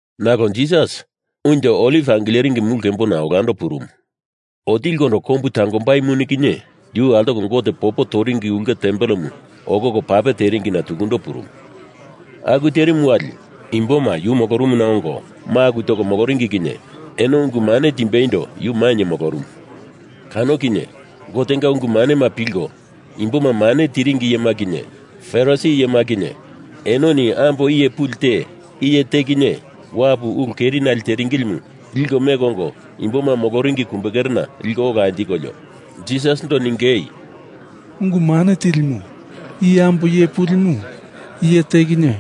Nalo Jisas Unjo Oliv Angileringi Mulu Kembona olando purumu. Otilikondo kombu tangombai muni kinye yu altopa Gote popo toringi ulke tempelemu okoko pape teringina tukundo purumu. Aku terimu wali imboma yu molorumuna ongo maku toko moloringi kinye eno ungu mane timbeindo yu mainye molorumu. Kano kinye Gotenga ungu manema pilko imboma mane tiringi iyema kinye Farisi iyema kinye enoni ambo iye puli te iye te kinye wapu ulu kerinale teringilimu liko meko ongo imboma moloringi kumbekerena liko ola anjikolio, Jisasindo ningei, “Ungu Mane Tilimu, i ambo iye pulimu iye te kinye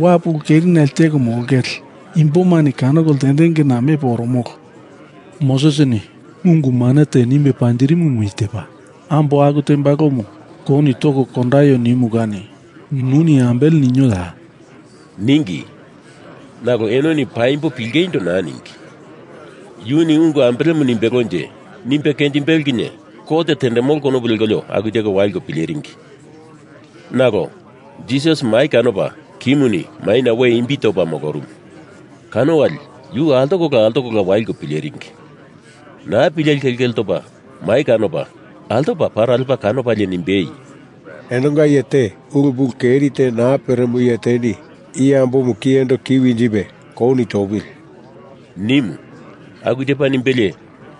wapu ulu keri nale teko molongele imbomani kanoko ltendengena mepo oromolo. Mosesini ungu mane te nimbe panjirimumu i tepa. Ambo aku tembalomu kouni toko kondaio nimu kani nuni ambele ninoya?” ningi. Nalo enoni paimbo pilingeindo naa ningi. Yuni ungu ambelemu nimbelonje, nimbe kenjimbelo kinye kot tendemolo konopu lekolio aku teko waliko pileringi. Nalo Jisas mai kanopa kimuni maina we imbi topa molorumu. Kano wali yu altokola altokola waliko pileringi. Naa pileli kelkele topa mai kanopa altopa para lepa kanopalie nimbei, “Enonga iye te ulu pulu keri te naa peremo iye teni i ambomu kiyendo ki winjipe kouni topili!” nimu. Aku tepa nimbelie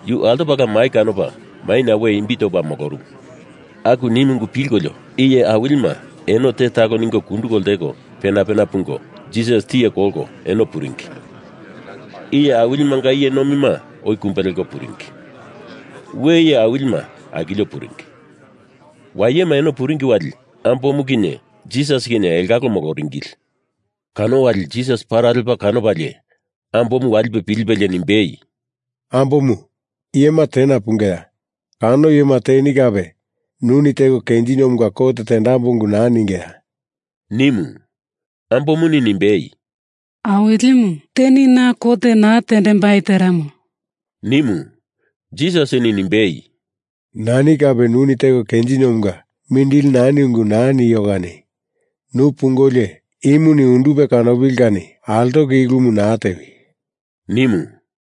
yu altopala mai kanopa maina we imbi topa molorumu. Aku nimu ungu pilkolio iye awilima eno te talo ningo kunduko lteko pena pena pungo Jisas tiye kolko eno puringi. Iye awilimanga iye nomima oi kumbe leko puringi. We iye awilima akilko puringi. Wayema eno puringi wali, ambomu kinye Jisas kinye elongalo moloringili. Kano wali Jisas para lepa kanopalie ambomu walipe pilipelie nimbei, “Ambomu, iyema tena pungeya? Kano iyema teni kape nuni teko kenjiniomunga kot tendambo ungu naa ningeya?” nimu. Ambomuni nimbei, “Awilimu, teni na kot naa tendembai teremo,” nimu. Jisasini nimbei, “Nani kape nuni teko kenjiniomunga mindili nani ungu naa nio kani nu pungolio imuni undupe kanopili kani altoko i ulumu naa tewi!” nimu.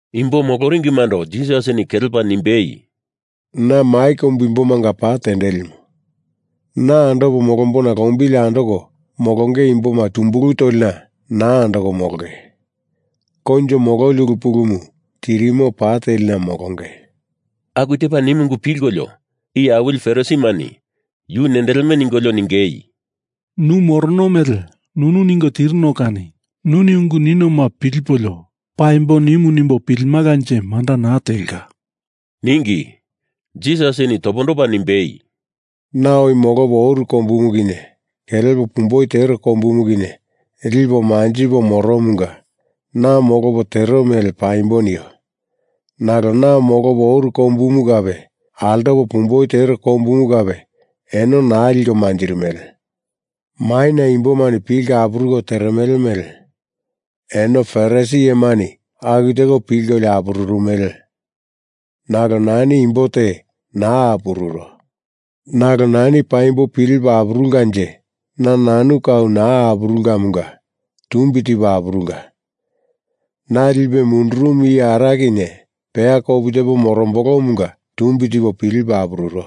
Imbo moloringimando Jisasini kelepa nimbei, “Na mai kombu imbomanga pa tendelimu. Na andopo molombona lombili andoko molonge imboma tumbulu tolina naa andoko molonge. Koinjo mololi ulu pulumu tirimo pa telina molonge.” Aku tepa nimu ungu pilkolio iye awili Farisimani yu nendeleme ningolio ningei, “Nu morono mele nunu ningo tirino kani nuni ungu ninoma pilipolio paimbo nimu nimbo pilimalanje manda naa telka,” ningi. Jisasini topondopa nimbei, “Na oi molopo oru kombumu kinye kelepo pumboi tero kombumu kinye lipo manjipo moromunga na molopo tero mele paimbo nio. Nalo na molopo oru kombumu kape altopo pumboi tero kombumu kape eno naa liko manjirimele. Maina imbomani pilko apuruko teremele mele eno Farisi iyemani aku teko pilkolio apururumele, nalo nani imbo te naa apururo. Nalo nani paimbo pilipo apurulkanje na nanu kau naa apurulkamunga tumbi tipo apurulka. Na lipe mundurumu iye Ara kinye peya kopu tepo morombolomunga tumbi tipo pilipo apururo.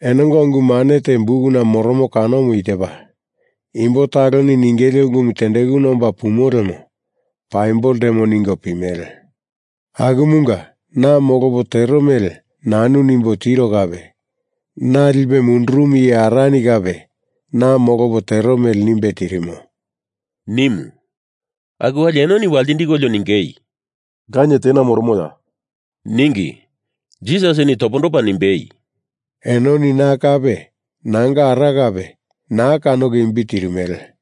Enonga ungu mane te bukuna moromo kanomu i tepa: Imbo taloni ningele ungumu tendekuna omba pumo lemo paimbo ltemo ningo pimele. Akumunga na molopo tero mele nanu nimbo tiro kape; na lipe mundurumu iye Arani kape na molopo tero mele nimbe tirimo,” nimu. Aku wali enoni waltindikolio ningei, “Lanie tena moromoya?” ningi. Jisasini topondopa nimbei, “Enoni na kape nanga Ara kape naa kanoko imbi tirimele.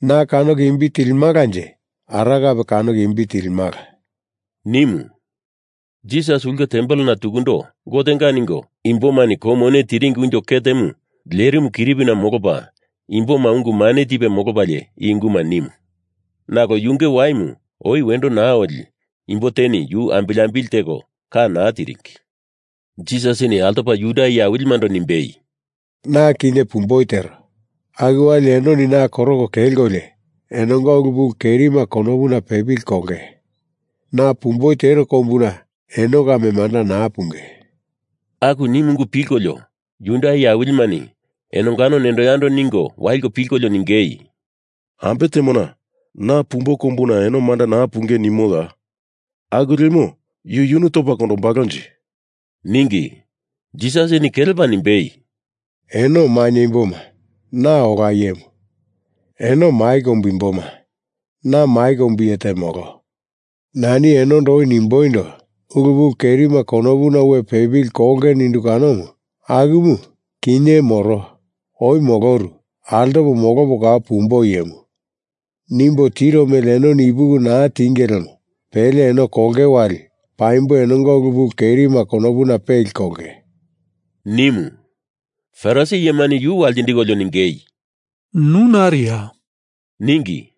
Na kanoko imbi tilimalanje Ara kape kanoko imbi tilimala,” nimu. Jisas ulke tempelena tukundo, Gotenga ningo imbomani kou mone tiringi unjo ketemu lerimu kiripina molopa imboma ungu mane tipe molopalie i unguma nimu. Nalo yunge waimu oi wendo naa oli imbo teni yu ambili ambili teko ka naa tiringi. Jisasini altopa Juda iye awilimando nimbei, “Na kinye pumboi tero, aku wali enoni na koroko kelkolio enonga ulu pulu kerima konopuna pepili kolonge. Na pumboi tero kombuna eno kame manda naa punge,” Aku nimu ungu pilkolio Juda iye awilimani enongano nendo yando ningo waliko pilkolio ningei, “Ambe temona ‘Na pumbo kombuna eno manda naa punge’ nimoya? Aku lemo yu yunu topa kondombalonje?” ningi. Jisasini kelepa nimbei, “Eno mainye imboma, na ola iyemu. Eno mai kombu imboma na mai kombu iye te molo. Nani enondo oi nimboindo, ulu pulu kerima konopuna we pepili kolonge nindu kanomu. Akumu kinye moro oi moloru altopo molopo kau pumbo iyemu nimbo tiro mele enoni ipuki naa tienge lemo pele eno kolonge wali paimbo enonga ulu pulu kerima konopuna peli kolonge,” nimu. Farisi iyemani yu waltindikolio ningei, “Nu nariya?” ningi.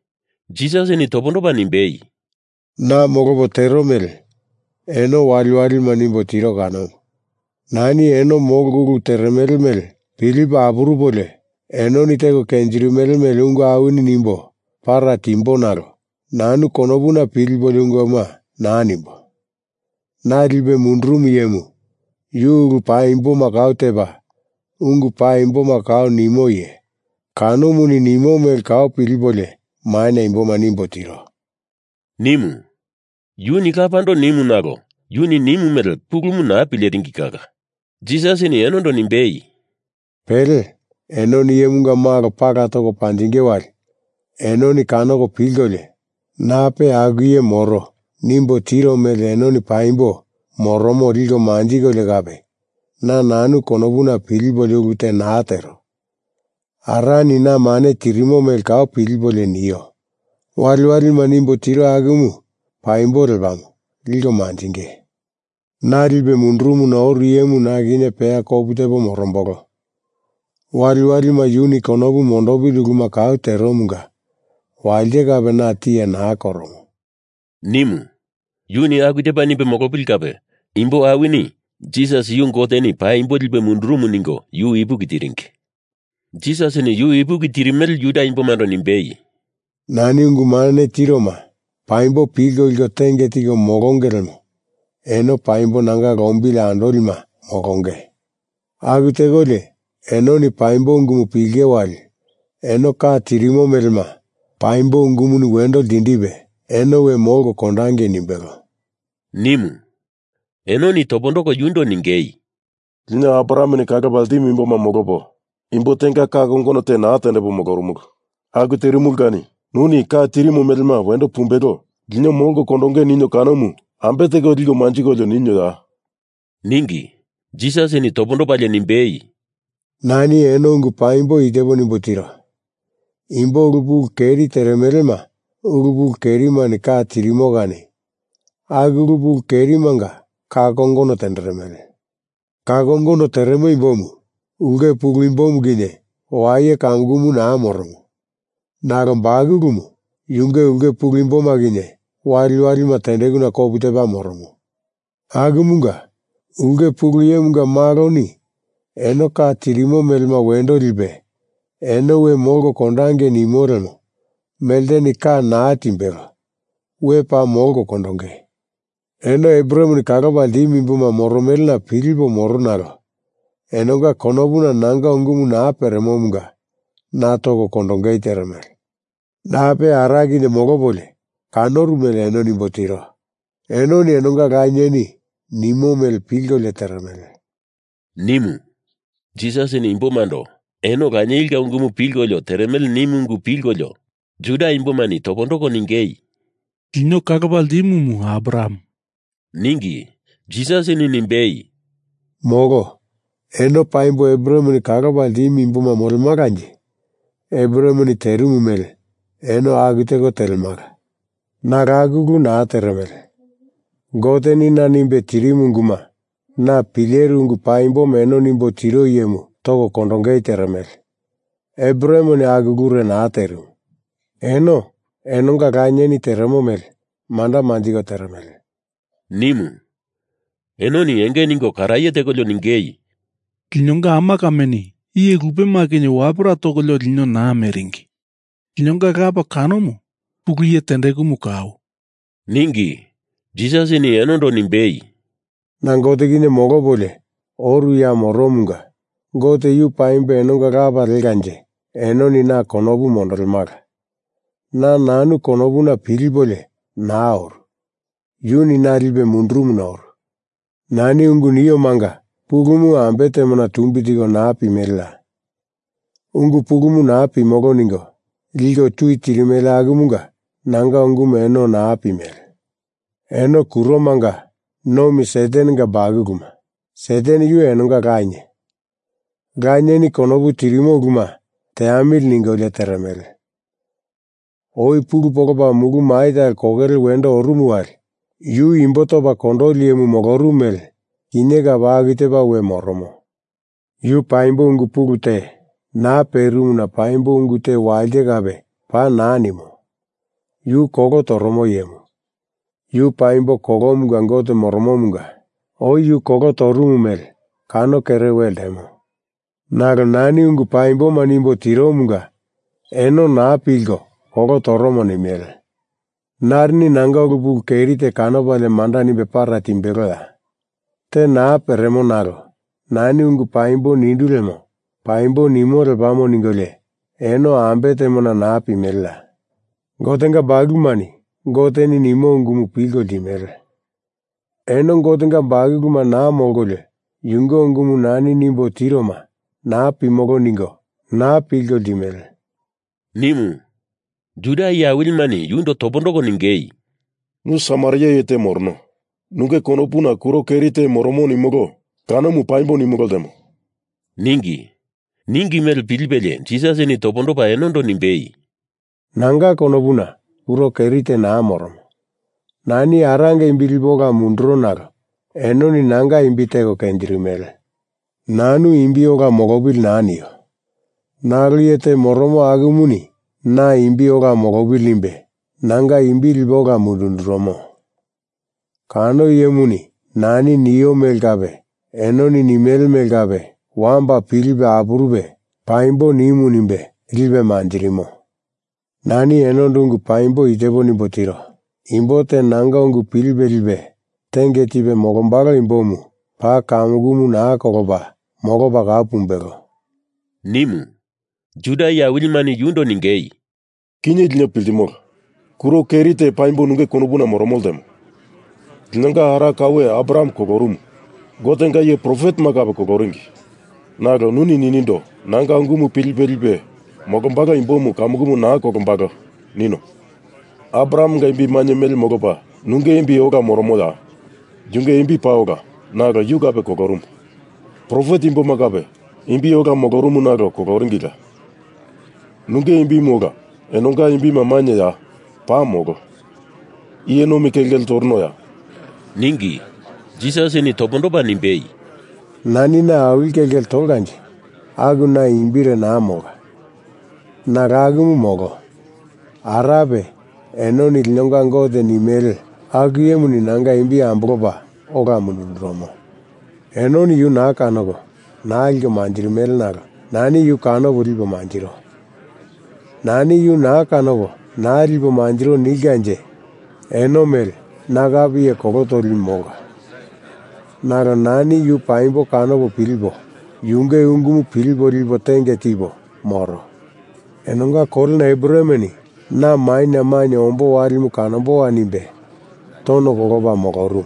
Jisasini topondopa nimbei, “Na molopo tero mele eno waliwalima nimbo tiro kanomu. Nani eno molko ulu teremele mele pilipo apurupolio enoni teko kenjirimele mele ungu awini nimbo para timbo nalo nanu konopuna pilipolio unguma naa nimbo. Na lipe mundurumu iyemu, yu ulu paimboma kau tepa ungu paimboma kau nimo iye, kanomuni nimo mele kau pilipolio maina imboma nimbo tiro,” nimu. Yuni Lapando nimu nalo yuni nimu mele pulumu naa pileringi kala. Jisasini enondo nimbei, “Pele enoni Iyemunga Malo pala toko panjinge wali enoni kanoko pilkolio Nape aku iye moro nimbo tiro mele enoni paimbo moromo liko manjikolio kape, na nanu konopuna pilipolio ulu te naa tero. Arani na mane tirimo mele kau pilipolio nio waliwalima nimbo tiro akumu paimbo lepamo liko manjinge. Na lipe mundurumuna oru iyemu na kinye peya kopu tepo morombolo. Waliwalima yuni konopu mondopili uluma kau teromunga walite kape na tiye naa koromo,” nimu. Yuni aku tepa nimbe molopili kape imbo awini Jisas yu Goteni paimbo lipe mundurumu ningo yu ipuki tiringi. Jisasini yu ipuki tirimele Juda imbomando nimbei, “Nani ungu mane tiroma paimbo pilko liko tenge tiko molonge lemo eno paimbo nanga lombili andolima molonge. Aku tekolio enoni paimbo ungumu pilinge wali eno ka tirimo melema paimbo ungumuni wendo ltindipe eno we molko kondangei nimbelo,” nimu. Enoni topondoko yundo ningei, “Lino Abrahameni kalopa ltimu imboma molopo imbo tenga ka kongono te naa tendepo molorumulu. Aku terimulu kani nuni ka tirimo melema wendo pumbelo lino molko kondonge ninio kanomu ambe teko liko manjikolio ninoya?” ningi. Jisasini topondopalie nimbei, “Nani eno ungu paimbo i tepo nimbo tiro. Imbo ulu pulu keri teremelema ulu pulu kerimani ka tirimo kani aku ulu pulu kerimanga ka kongono tenderemele. Ka kongono teremo imbomu ulke pulu imboma kinye waye kamukumu naa moromo, nalo bakulumu yunge ulke pulu imboma kinye waliwalima tendekuna kopu tepa moromo. Akumunga Ulke Pulu Iyemunga Maloni eno ka tirimo melema wendo lipe eno we molko kondangei nimo lemo melteni ka naa timbelo we paa molko kondonge. Eno Abrahameni kalopa ltimu imboma moromelena pilipo moro nalo enonga konopuna nanga ungumu naa peremomunga na toko kondongei teremele. Nape Ara kinye molopolio kanoru mele eno nimbo tiro. Enoni enonga lanieni nimo mele pilkolio teremele,” nimu. Jisasini imbomando, eno lanienga ungumu pilkolio teremele nimu ungu pilkolio Juda imbomani topondoko ningei, “Lino kalopa ltimumu Abraham,” ningi. Jisasini nimbei, “Molo. Eno paimbo Abrahameni kalopa ltimu imboma molemalanje Abrahameni terimu mele eno aku teko telemala. Nalo aku ulu naa teremele. Goteni na nimbe tirimu unguma na pileru ungu paimboma eno nimbo tiro iyemu toko kondongei teremele. Abrahameni aku ulure naa terimu. Eno enonga lanieni teremo mele manda manjiko teremele,” nimu. Enoni enge ningo karaye tekolio ningei, “Linonga ama kameni iye lupema kinye wapera tokolio lino naa meringi. Linonga lapa kanomu Pulu Iye tendekumu kau,” ningi. Jisasini enondo nimbei, “Na Gote kinye molopolio oru ya moromunga Gote yu paimbo enonga Lapa lekanje enoni na konopu mondolemala. Na nanu konopuna pilipolio naa oru. Yuni na lipe mundurumuna oru. Nani ungu niomanga pulumu ambe temona tumbi tiko naa pimeleya? Ungu pulumu naa pimolo ningo liko tui tirimele akumunga nanga ungumu eno naa pimele. Eno kuromanga nomi Satanenga bakuluma, Satan yu enonga lanie. Lanieni konopu tirimo uluma teamili ningolio teremele. Oi pulu polopa mulu mai talo kokele wendo orumu wali yu imbo topa kondoli iyemu molorumu mele kinye kape aku tepa we moromo. Yu paimbo ungu pulu te naa perimuna paimbo ungu te walite kape paa naa nimo. Yu kolo toromo iyemu; yu paimbo kolomunga gote moromomunga oi yu kolo torumu mele kano kere we ltemo. Nalo nani ungu paimboma nimbo tiromunga eno naa pilko kolo toromo nimele. Narini nanga ulu pulu keri te kanopalie manda nimbe para timbeloya? Te naa peremo nalo nani ungu paimbo nindu lemo paimbo nimo lepamo ningolio eno ambe temona naa pimeleya? Gotenga bakulumani Goteni nimo ungumu pilko ltimele. Eno Gotenga bakuluma naa molkolio yunge ungumu nani nimbo tiroma naa pimolo ningo naa pilko ltimele,” nimu. Juda iye awilimani yundo topondoko ningei, “Nu Samaria iye te morono, nunge konopuna kuro keri te moromo nimolo kanomu paimbo nimolo ltemo,” ningi. Ningi mele pilipelie Jisasini topondopa enondo nimbei, “Nanga konopuna kuro keri te naa moromo. Nani Aranga imbi lipo ola munduro nalo enoni nanga imbi teko kenjindirimele. Nanu imbi ola molopili naa nio, nalo iye te moromo akumuni na imbi ola molopili nimbe nanga imbi lipe ola mundundurumo. Kano iyemuni nani nio mele kape enoni nimele mele kape wamba pilipe apurupe paimbo nimu nimbe lipe manjirimo. Nani enondo ungu paimbo i tepo nimbo tiro. Imbo te nanga ungu pilipe lipe tenge tipe molombalo imbomu paa kamukumu naa kolopa molopa kau pumbelo,” nimu. Juda iye awilimani yundo ningei, “Kinye lino piltimolo. Kuro keri te paimbo nunge konopuna moromo lemo. Linonga ara kaue Abraham kolorumu. Gotenga iye profetema kape koloringi. Nalo nuni ninindo, ‘Nanga ungumu pilipe lipe molombalo imbomu kamukumu naa kolombalo,’ nino. Abrahamenga imbi mainye mele molopa nunge imbi ola moromoya? Yunge imbi paa ola, nalo yu kape kolorumu. Profet imboma kape imbi ola molorumu nalo koloringila. Nunge imbimu ola enonga imbima mainyeya? Paa molo. Iye nomi kelkele toronoya,” ningi. Jisasini topondopa nimbei, “Nani na awili kelkele tolkanje aku na imbire naa molka. Nalo akumu molo. Arape, enoni linonga Gote nimele aku iyemuni nanga imbi ambolopa ola mundundurumo. Enoni yu naa kanoko naa liko manjirimele nalo nani yu kanopo lipo manjiro. Nani yu naa kanopo naa lipo manjiro nilkanje eno mele na kape iye kolo toli molka. Nalo nani yu paimbo kanopo pilipo, yunge ungumu pilipo lipo tenge tipo moro. Enonga kolena Abrahameni na maina mainye ombo walimu kanomboya nimbe tono kolopa molorumu.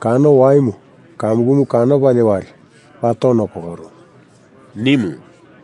Kano waimu kamukumu kanopalie wali paa tono kolorumu,” nimu.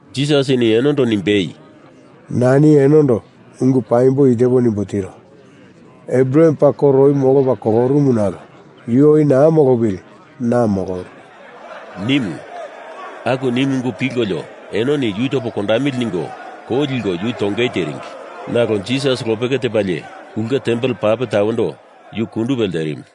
Jisasini enondo nimbei, “Nani enondo ungu paimbo i tepo nimbo tiro. Abraham paa koro oi molopa kolorumu nalo yu oi naa molopili na moloru,” nimu. Aku nimu ungu pilkolio enoni yu topo kondamili ningo kou liko yu tongei teringi. Nalo Jisas lopeke tepalie, ulke tempel pape tawendo yu kundupe lerimu.